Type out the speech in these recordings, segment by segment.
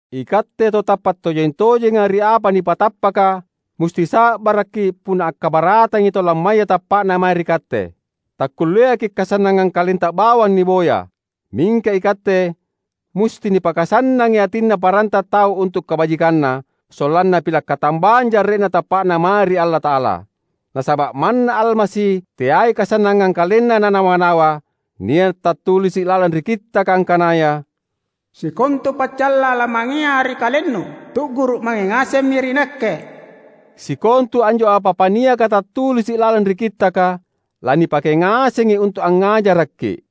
Ikatte tau tappa’ tojeng-tojenga ri apa nipatappaka musti sa’barakki’ punna akkabaratangi tau lammaya tappa’na mae ri katte. Takkulleaki’ kasannangang kalenta bawang niboya. Mingka ikatte musti nipakasannangi atinna paranta tau untu’ kabajikanna, sollanna pila’ katambang jarre’na tappa’na mae ri Allata’ala. Nasaba’ manna Almasi teai kasannangang KalenNa Nanawa-nawa. Nia’ tattulisi’ lalang ri Kittaka angkanaya, "Sikontu paccalla lamangea ri kalennu, tu’guru’ mange ngasemmi ri Nakke." Sikontu anjo apa-apa niaka tattulisi’ lalang ri Kittaka, lanipake ngasengi untu’ angngajarakki’.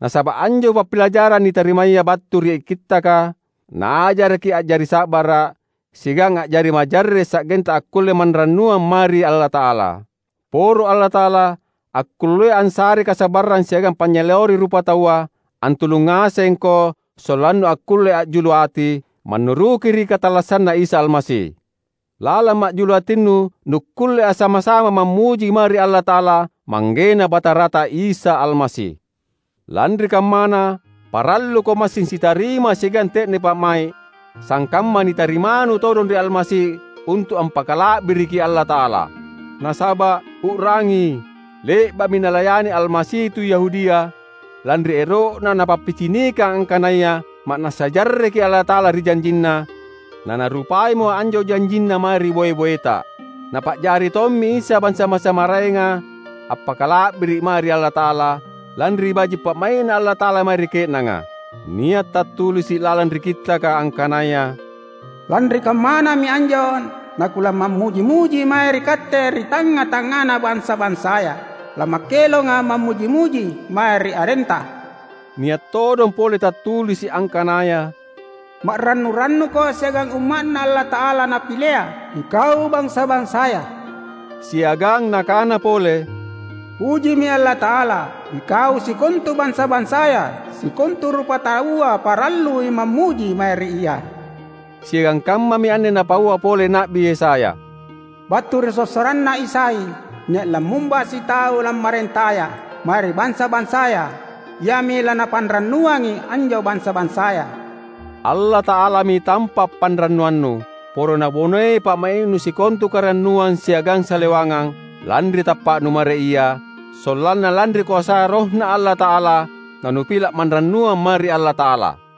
Nasaba’ anjo pappilajarang nitarimaya battu ri Kittaka naajarakki’ a’jari sa’bara’ siagang a’jari majarre’ sanggenta akkulle manrannuang mae ri Allata’ala. Poro Allata’ala, akkullea assarei kasa’barrang siagang panynyaleori rupataua, antulung ngasengko sollannu akkulle a’julu ati, mannuruki ri katallassanNa Isa Almasi. Lalang ma’julu atinu nukkulle assama-sama mammuji mae ri Allata’ala, ManggeNa Batarata Isa Almasi. Lanri kammana, paralluko massing sitarima siagang te’ne pa’mai’, sangkamma nitarimanu todong ri Almasi untu’ ampakala’biriki Allata’ala. Nasaba’, u’rangi, le’ba’mi Nalayani Almasi tu Yahudia, lanri ero’Na Napappicinikang angkanaya ma’nassa jarreki Allata’ala ri janjinNa, naNarupaimo anjo janjinNa mae ri boe-boeta. Napa’jari tommi Isa bansa-bansa maraenga appakala’biri’ mae ri Allata’ala, lanri baji’ pa’mai’Na Allata’ala mae ri ke’nanga. Nia’ tattulisi’ lalang ri Kittaka, angkanaya, "Lanri kammanami anjo nakulamammuji-muji mae ri Katte ri tangnga-tangngana bansa-bansaya, lamakkelonga’ mammuji-muji mae ri arenTa." Nia’ todong pole tattulisi’ angkanaya, "Ma’rannu-rannuko siagang umma’Na Allata’ala Napilea, ikau bansa-bansaya!" Siagang nakana pole, "Pujimi Allata’ala, ikau sikontu bansa-bansaya, sikontu rupataua parallui mammuji mae ri Ia!" Siagang kammami anne napaua pole Na’bi Yesaya, "Battu ri sossoranna Isai nia’ lammumba sitau lammarentaya mae ri bansa-bansaya; Iami lanapanrannuangi anjo bansa-bansaya." Allata’alami tampa’ panrannuannu. Poro Nabonei pa’mai’nu sikontu karannuang siagang salewangang, lanri tappa’nu mae ri Ia, sollanna lanri koasa RohNa Allata’ala nanupila’ manrannuang mae ri Allata’ala.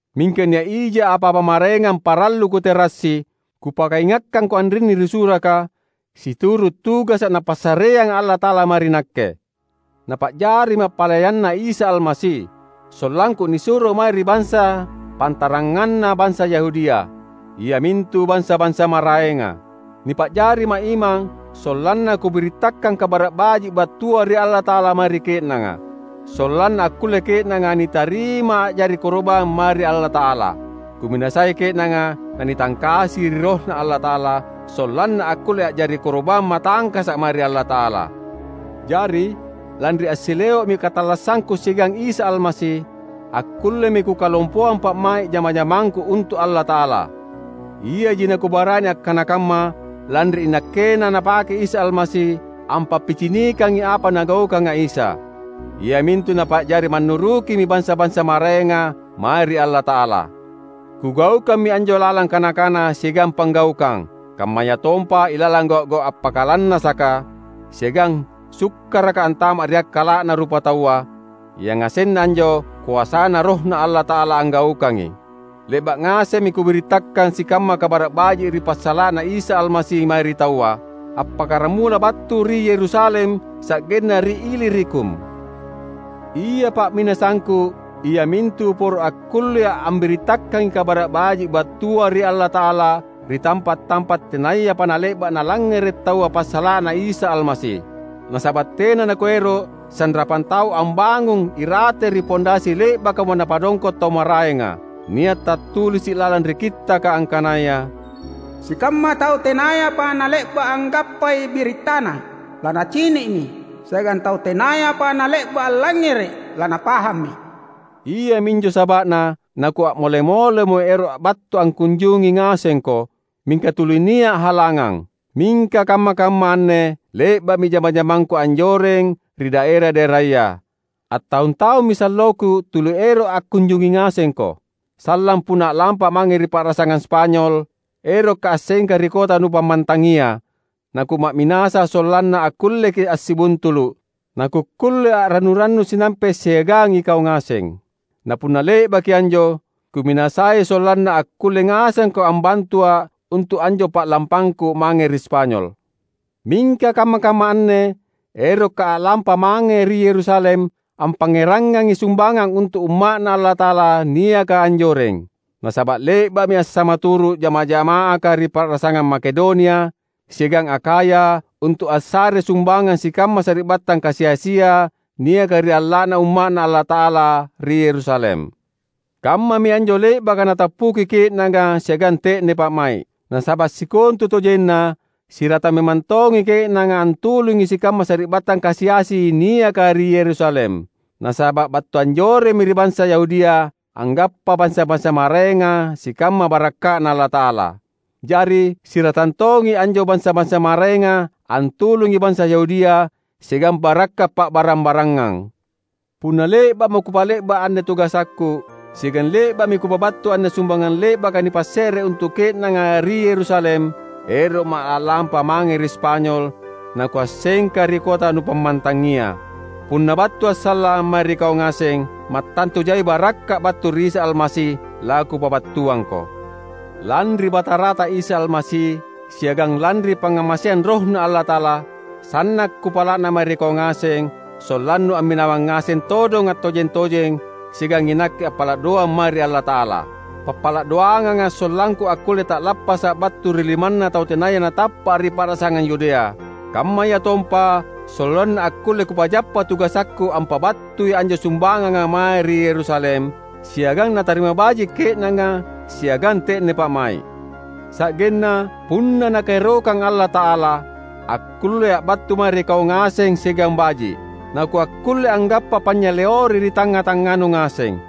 Mingka nia’ija apa-apa maraengang parallu kuterassi kupakaingakkangko anrinni ri suraka, situru’ tugasa’ Napassareanga Allata’ala mae ri nakke. Napa’jarima’ palayanNa Isa Almasi, sollangku nisuro mae ri bansa pantaranganna bansa Yahudia, iamintu bansa-bansa maraenga. Nipa’jarima’ imang sollanna kubirittakang Kabara’ Baji’ battua ri Allata’ala mae ri ke’nanga, sollanna akkulle ke’nanga nitarima a’jari koro’bang mae ri Allata’ala. Kuminasai ke’nanga nanitangkasi ri RohNa Allata’ala, sollanna akkulle a’jari koro’bang matangkasa’ mae ri Allata’ala. Jari, lanri assileo’mi katallassangku siagang Isa Almasi, akkullemi kukalompoang pa’mai’ jama-jamangku untu’ Allata’ala. Iaji nakubarani akkana kamma lanri inakkena Napake Isa Almasi ampappicinikangi apa Nagaukanga Isa, iamintu Napa’jari mannurukimi bansa-bansa maraenga mae ri Allata’ala. Kugaukammi anjo lalang kana-kana siagang panggaukang; kammayatompa ilalang gau’-gau’ appakalannasaka, siagang sukkaraka antama’ ri akkala’na rupataua; yangasenna anjo koasaNa RohNa Allata’ala anggaukangi. Le’ba’ ngasemmi kubirittakang sikamma Kabara’ Baji’ ri passala’na Isa Almasi mae ri taua, appakkaramula battu ri Yerusalem sa’genna ri Ilirikum. Ia pa’minasangku iamintu poro akkullea’ ambirittakangi Kabara’ Baji’ battua ri Allata’ala ri tampa’-tampa’ tenayapa nale’ba’ nalangngere’ taua passala’na Isa Almasi. Nasaba’ tena nakuero’ sanrapang tau ambangung irate ri pondasi le’bakamo napadongko’ tau maraenga. Nia’ tattulisi’ lalang ri Kittaka angkanaya, "Sikamma tau tenayapa nale’ba’ anggappai birittaNa, lanacini’mi; siagang tau tenayapa nale’ba’ allangngere’, lanapahammi." Iami anjo saba’na nakua’mole-molemo ero’ battu angkunjungi ngasengko, mingka tuli nia’ halangang. Mingka kamma-kamma anne le’ba’mi jama-jamangku anjoreng ri daera-daeraya. Attaung-taummi salloku tuli ero’ angkunjungi ngasengko. Sallang punna a’lampa’ mange ri pa’rasangang Spanyol, erokka’ assengka ri kota nupammantangia; nakuma’minasa sollanna akkulleki’ assibuntulu’, nakukkulle a’rannu-rannu sinampe’ siagang ikau ngaseng. Napunna le’baki anjo, kuminasai sollanna akkulle ngasengko ambantua’ untu’ anjo pa’lampangku mange ri Spanyol. Mingka kamma-kamma anne erokka’ a’lampa mange ri Yerusalem ampangngerangangi sumbangang untu’ umma’Na Allata’ala niaka anjoreng. Nasaba’ le’ba’mi assamaturu’ jamaah-jama’aka ri pa’rasangang Makedonia siagang Akhaya untu’ assarei sumbangang sikamma sari’battang kasi-asia niaka ri alla’na umma’Na Allata’ala ri Yerusalem. Kammami anjo le’baka natappuki ke’nanga siagang te’ne pa’mai’. Nasaba’ sikontutojenna siratang memang tongi ke’nanga antulungi sikamma sari’battang kasi-asi niaka ri Yerusalem; nasaba’ battu anjoremmi ri bansa Yahudia anggappa bansa-bansa maraenga sikamma barakka’Na Allata’ala. Jari, siratang tongi anjo bansa-bansa maraenga antulungi bansa Yahudia siagang barakka’ pa’barang-barangang. Punna le’ba’mo kupa’le’ba’ anne tugasakku, siagang le’ba’mi kupabattu anne sumbangang le’baka nipasse’re untu’ ke’nanga ri Yerusalem, ero’ma’ a’lampa mange ri Spanyol nakuassengka ri kota nupammantangia. Punna battua’ sallang mae ri kau ngaseng, mattantu jai barakka’ battu ri Isa Almasi lakupabattuangko. Lanri Batarata Isa Almasi, siagang lanri pangngamaseang RohNa Allata’ala, sanna’ kupala’na mae ri kau ngaseng sollannu amminawang ngaseng todong attojeng-tojeng siagang inakke appala’ doang mae ri Allata’ala. Pappala’ doanganga’ sollangku akkulle ta’lappasa’ battu ri limanna tau tenaya natappa’ ri pa’rasangang Yudea; kammayatompa sollanna akkulle kupajappa tugasakku ampabattui anjo sumbanganga mae ri Yerusalem, siagang natarima baji’ ke’nanga siagang te’ne pa’mai’. Sa’genna, punna Nakaerokang Allata’ala, akkullea’ battu mae ri kau ngaseng siagang baji’. Nakuakkulle anggappa panynyaleori ri tangnga-tangnganu ngaseng.